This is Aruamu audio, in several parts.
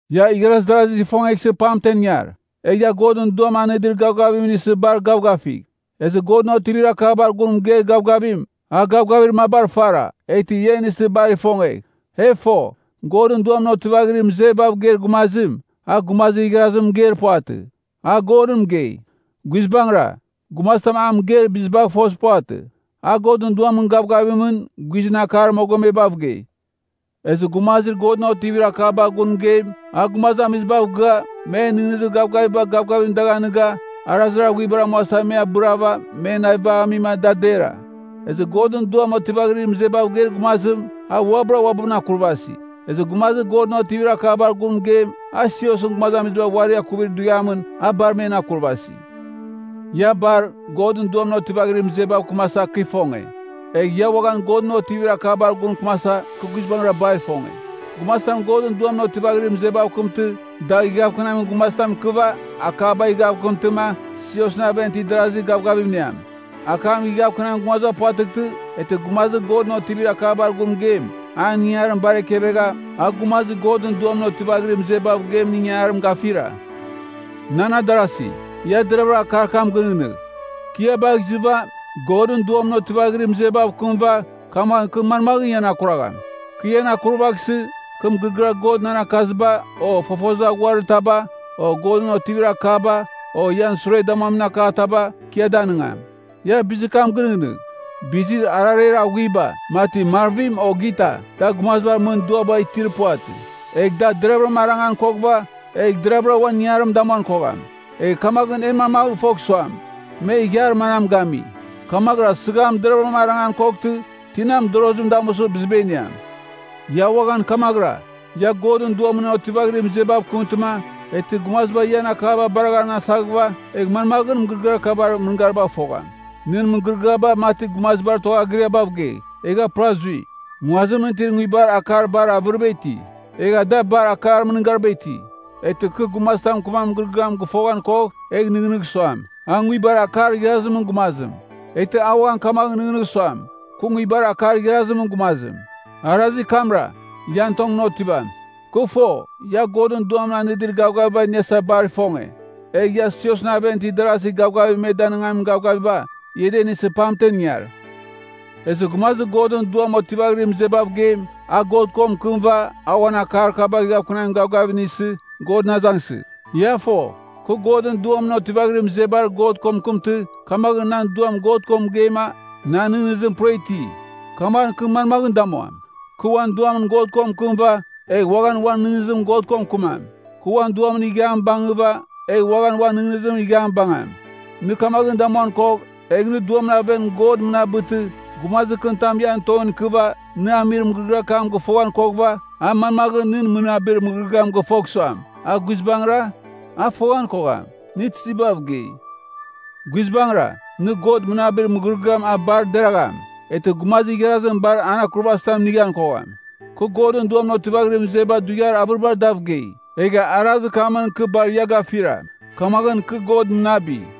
Ia igharaz darazigh ifongeghsɨ pamtemɨn ingar. Egh ia Godɨn Duam anɨdir gavgaviba inisɨ bar gavgafigh. Ezɨ Godɨn otivir akabar gun mɨgeir gavgavim, a gavgavir mabar fara, eghtɨ ia inisɨ bar ifongegh. E fo, Godɨn Duamɨn otivaghirir mɨzebav geir gumazim, a gumazir igharazim mɨgeir puvatɨ. A Godɨn mɨgei. Guizbangɨra, gumazitam a mɨgeir bizibagh fozir puvatɨ. A Godɨn Duamɨn gavgavimɨn, guizɨn akar mogomebav gei. Ezɨ gumazir Godɨn otivir akaba gun mɨgeim, a gumazamizibav gɨa, men nɨghnɨzir gavgaviba gavgavim dagh anɨga, arazir aghuibar amuasa me abɨrava, men navibagh amima da dera. Ezɨ Godɨn Duam otivaghirir mɨzebav geir gumazim, a uabɨra uabɨn akurvasi. Ezɨ gumazir Godɨn otivir akaba gun mɨgeim, a siosɨn gumazamiziba uari akuvir dughiamɨn, a bar men akurvasi. Ia bar, Godɨn Duamɨn otivaghirir mɨzebav kɨmasa, kɨ ifonge. Egh ia uaghan Godɨn otivir akabar gun mɨkɨmasa, kɨ guizbangɨra bar ifonge. Gumazitam Godɨn Duamɨn otivaghirir mɨzebav kɨmtɨ, dagh ighavkɨnamin gumazitam ikɨva akabagh ighavkɨntɨma, siosɨn aven itir adarazi gavgavim iniam. Akam ighavkɨnamin gumaziba puvatɨghtɨ, eghtɨ gumazir Godɨn otivir akabar gun mɨgeim, an ingangarim bar ekevegha, a gumazir Godɨn Duamɨn otivaghirir mɨzebav geimɨn ingangarim gafira. Nan adarasi, ia deravɨra akar kam gɨnɨghnɨgh. Kɨ ia bagh izɨva, Godɨn Duamɨn otivaghirir mɨzebav kɨmɨva, kamaghɨn kɨ manmaghɨn ian akuragham? Kɨ ian akurvaghsɨ, kɨ mɨgɨrɨgɨar God nan akazitaba, o fofozir aghuir taba, o Godɨn otivir akataba, o ian sure damuamin akataba, kɨ ia danɨngam. Ia bizir kam ginɨghnɨgh. Bizir arareir aghuiba, mati marvim o gita, da gumazibar mɨn duaba itir puvatɨ. Egh da deraghvɨra arangan koghɨva, egh deraghvɨra uan ingangarim damuan kogham. Egh kamaghɨn e manmaghɨn fogh suam, me ighiar manam gami? Kamaghɨra sɨgham deraghvɨram arangan koghtɨ, tina mɨdorozim damusɨ biziba iniam? Ia uaghan kamaghɨra. Ia Godɨn Duamɨn otivaghirir mɨzebav kɨmtɨma, eghtɨ gumaziba ian akaba baraghan asaghɨva, egh manmaghɨn mɨgɨrɨgɨar kabar mɨngaribagh fogham? Nɨn mɨgɨrɨgɨaba, mati gumazibar tuaghagɨriabav gei, egha pura zui. Nguazimɨn itir nguibar akar bar avɨriba iti. Egha da bar akar mɨngariba iti. Eghtɨ kɨ gumazitam mɨkɨmamin mɨgɨrɨgɨam gɨfoghan kogh, egh nɨghnɨgh suam, a nguibar akar igharazimɨn gumazim. Eghtɨ a uaghan kamaghɨn nɨghnɨgh suam, kɨ nguibar akar igharazimɨn gumazim. Arazir kamra, ian tongɨn otivam. Kɨ fo, ia Godɨn Duam anɨdir gavgaviba iniasa bar ifonge. Egh ia siosɨn aven itir darasi gavgavim me danɨngamin gavgaviba, ia da inisɨ pamtemɨn ingar. Ezɨ gumazir Godɨn Duam otivaghirir mɨzebav geim, a God ko mɨkɨmɨva, a uan akar kaba ighavkɨnamin gavgavim inisɨ, Godɨn azangsɨgh. Ia fo, kɨ Godɨn Duamɨn otivaghirir mɨzebar God ko mɨkɨmtɨ, kamaghɨn nan duam God ko mɨgeima, na nɨghnɨzim pura iti. Kamaghɨn kɨ manmaghɨn damuam? Kɨ uan duamɨn God ko mɨkɨmɨva, egh uaghan uan nɨghnɨzimɨn God ko mɨkɨmam. Kɨ uan duamɨn ighiam bangɨva, egh uaghan uan nɨghnɨzimɨn ighiam bangam. Nɨ kamaghɨn damuan kogh, egh nɨ duamɨn aven God mɨnabɨtɨ, gumazir kɨnitam ian tongɨn ikɨva, nɨ amir mɨgɨrɨgɨar kam gɨfoghan koghɨva, a manmaghɨn nɨn mɨnabir mɨgɨrɨgɨam gɨfogh suam, “A guizbangɨra?” A foghan kogham, nɨ tizibav gei. Guizbangɨra, nɨ God mɨnabir mɨgɨrɨgɨam a bar deragham. Eghtɨ gumazir igharazim bar akurvazitam inighan kogham. Kɨ Godɨn Duamɨn otivaghirir mɨzeba dughiar avɨribar dav gei, egha arazir kamɨn kɨ bar ia gafira. Kamaghɨn kɨ God mɨnabi.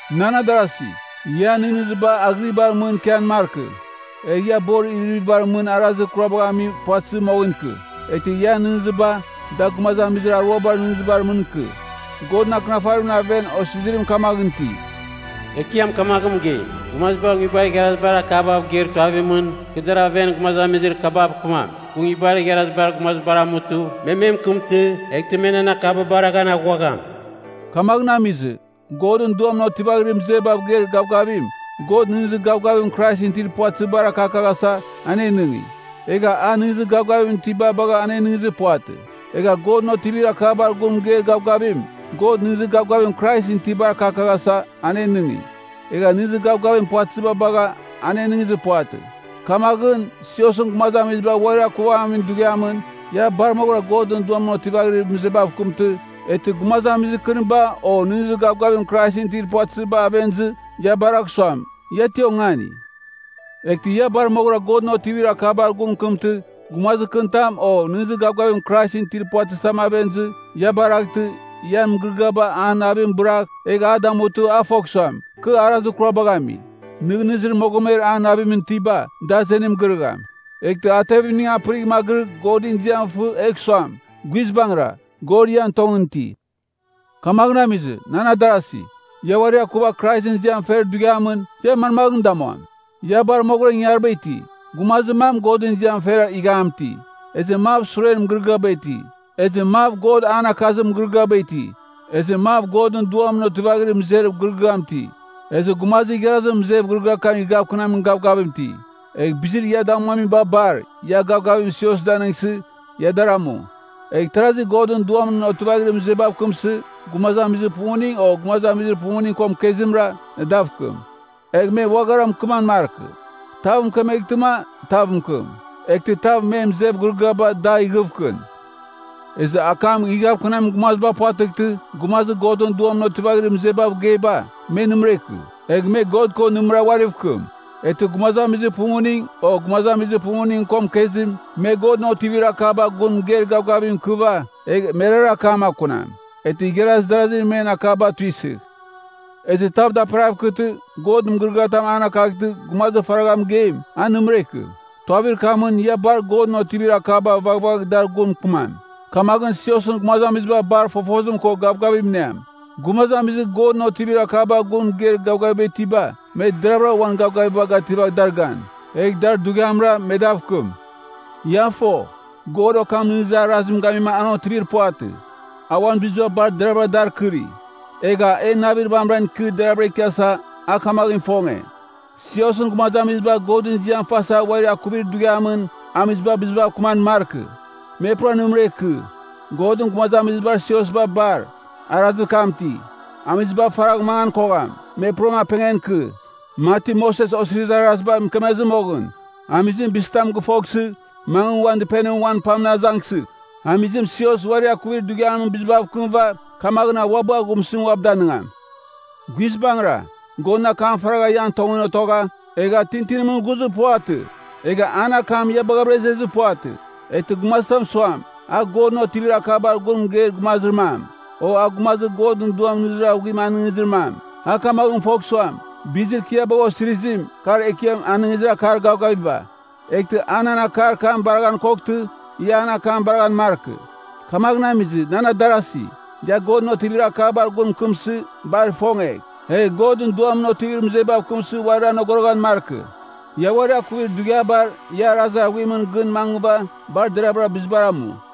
Nan adarasi, ian nɨghnɨziba aghɨribar mɨn ikian markɨ. Egh ia borir iririvibar mɨn arazir kurabagh ami puvatɨzɨ moghɨn ikɨ. Eghtɨ ian nɨghnɨziba, da gumazamizir aruabar nɨghnɨzibar mɨn ikɨ. Godɨn Akɨnafarimɨn aven osizirim kamaghɨn iti, “Ekiam kamaghɨn mɨgei, Gumaziba nguibar igharazibar akabav geir tuavimɨn, kɨ dar aven gumazamizir kabav kɨmam. Kɨ nguibar igharazibar gumazibar amutɨ, me me mɨkɨmtɨ, eghtɨ me nan akaba baraghan aghuagham.” Kamaghɨn amizɨ, Godɨn Duamɨn otivaghirir mɨzebav geir gavgavim, God nɨghnɨzir gavgavim Kraisɨn itir puvatɨzibar akakaghasa, anenɨngi. Egha a nɨghnɨzir gavgavim itiba bagha anenɨngizir puvatɨ. Egha Godɨn otivir akabar gun mɨgeir gavgavim, God nɨghnɨzir gavgavim Kraisɨn itibar akakaghasa, anenɨngi. Egha nɨghnɨzir gavgavim puvatɨziba bagha, anenɨngizir puvatɨ. Kamaghɨn, siosɨn gumazamiziba uari akuvaghamin dughiamɨn, ia bar moghɨra Godɨn Duamɨn otivaghirir mɨzebav kɨmtɨ, eghtɨ gumazamizir kɨniba o nɨghnɨzir gavgavim Kraisɨn itir puvatɨziba aven izɨ, ia baragh suam, ia ti ongani. Eghtɨ ia bar moghɨra Godɨn otivir akabar gun mɨkɨmtɨ, gumazir kɨnitam o nɨghnɨzir gavgavim Kraisɨn itir puvatɨzitav aven izɨ, ia baraghtɨ, ian mɨgɨrɨgɨaba an navim bɨragh, egh a damutɨ, a fogh suam, kɨ arazir kurabagh ami. Nɨghnɨzir mogomer an navimɨn itiba, da azenim girɨgham. Eghtɨ a tevimning apɨrigh magɨrɨgh, Godɨn ziam fɨ, egh suam, “Guizbangɨra, God ian tongɨn iti.” Kamaghɨn amizɨ, nan adarasi, ia uari akuva Kraisɨn ziam fer dughiamɨn, ia manmaghɨn damuam? Ia bar moghɨra ingangariba iti. Gumazir mam Godɨn ziam fer ighiam iti, ezɨ mav suren mɨgɨrɨgɨam iti, ezɨ mav God an akakazir mɨgɨrɨgɨam iti, ezɨ mav Godɨn Duamɨn otivaghirir mɨzev gɨrɨgɨam iti, ezɨ gumazir igharazim mɨzev gɨrɨgɨar kam ighavkɨnamin gavgavim iti. Egh bizir ia damuamiba bar, ia gavgavim sios danɨngsɨ, ia dar amu. Egh tarazi Godɨn Duamɨn otivaghirir mɨzebav kɨmsɨ, gumazamizir pumuning o gumazamizir pumuning ko mɨkezimra, dav mɨkɨmam. Egh me uaghara mɨkɨman markɨ. Tav mɨkemeghtɨma, tav mɨkɨm. Eghtɨ tav men mɨzev gɨrɨgɨabagh dagh ighɨvkɨn. Ezɨ akam ighɨvkɨnamin gumaziba puvatɨghtɨ, gumazir Godɨn Duamɨn otivaghirir mɨzebav geiba, me nɨmɨra ikɨ, egh me God ko nɨmɨra uariv kɨm. Eghtɨ gumazamizir pumuning, o gumazamizir pumuning ko mɨkezim, me Godɨn otivir akaba gun mɨgeir gavgavim ikɨva, egh merara akam akunam. Eghtɨ igharaz darazi men akaba tuisɨgh. Ezɨ tav daperaghav ikɨtɨ, God mɨgɨrɨgɨatam an akaghtɨ, gumazir faragha mɨgeim, a nɨmɨra ikɨ. Tuavir kamɨn, ia bar Godɨn otivir akaba vaghvagh dar gun mɨkɨmam, kamaghɨn siosɨn gumazamiziba bar fofozim ko gavgavam iniam. Gumazamizir Godɨn otivir akaba gun mɨgeir gavgaviba itiba, me deraghvɨra uan gavgaviba gativagh dar gan. Egh dar dughiamra, me dav kɨm. Ia fo, God okam nɨghnɨzir arazim gamima an otivir puvatɨ. A uan biziba bar deravɨra dar kɨri. Egha, e navir vamɨran ikɨ deraghvɨra ikiasa, a kamaghɨn ifonge. Siosɨn gumazamiziba Godɨn ziam fasa uari akuvir dughiamɨn, amiziba bizibav kɨman markɨ. Me pura nɨmɨra ikɨ. Godɨn gumazamizibar siosba bar, arazir kam iti. Amiziba faragh mangan kogham, me puram apengan ikɨ, mati Moses Osirizir Araziba mɨkemezɨ moghɨn. Amizim bizitam gɨfoghsɨ, mangɨ uan dɨpenimɨn uan pamɨn azangsɨgh. Amizim sios uari akuvir dughiamɨn bizibav kɨmɨva, kamaghɨn a uabɨ aghumsɨzim uabɨ danɨngam. Guizbangɨra, Godɨn akam faragha ian tongɨn otogha, egha tintinimɨn ghuzir puvatɨ. Egha an akam ia baghavɨra izezir puvatɨ! Eghtɨ gumazitam suam, a Godɨn otivir akabar gun mɨgeir gumazir mam, o a gumazir Godɨn Duam nɨghnɨzir aghuim anɨngizir mam, a kamaghɨn fogh suam, bizir kɨ ia bagha osirizim, kar Ekiam anɨngizir akar gavgaviba. Eghtɨ a nan akar kam baraghan koghtɨ, ia an akam baraghan markɨ. Kamaghɨn amizɨ, nan adarasi, ia Godɨn otivir akabar gun mɨkɨmsɨ, bar ifongegh. Egh Godɨn Duamɨn otivaghirir mɨzebav kɨmsɨ uarir anogoroghan markɨ. Ia uari akuvir dughiabar, ia arazir aghuimɨn gɨn mangɨva, bar deraghvɨra bizibar amu.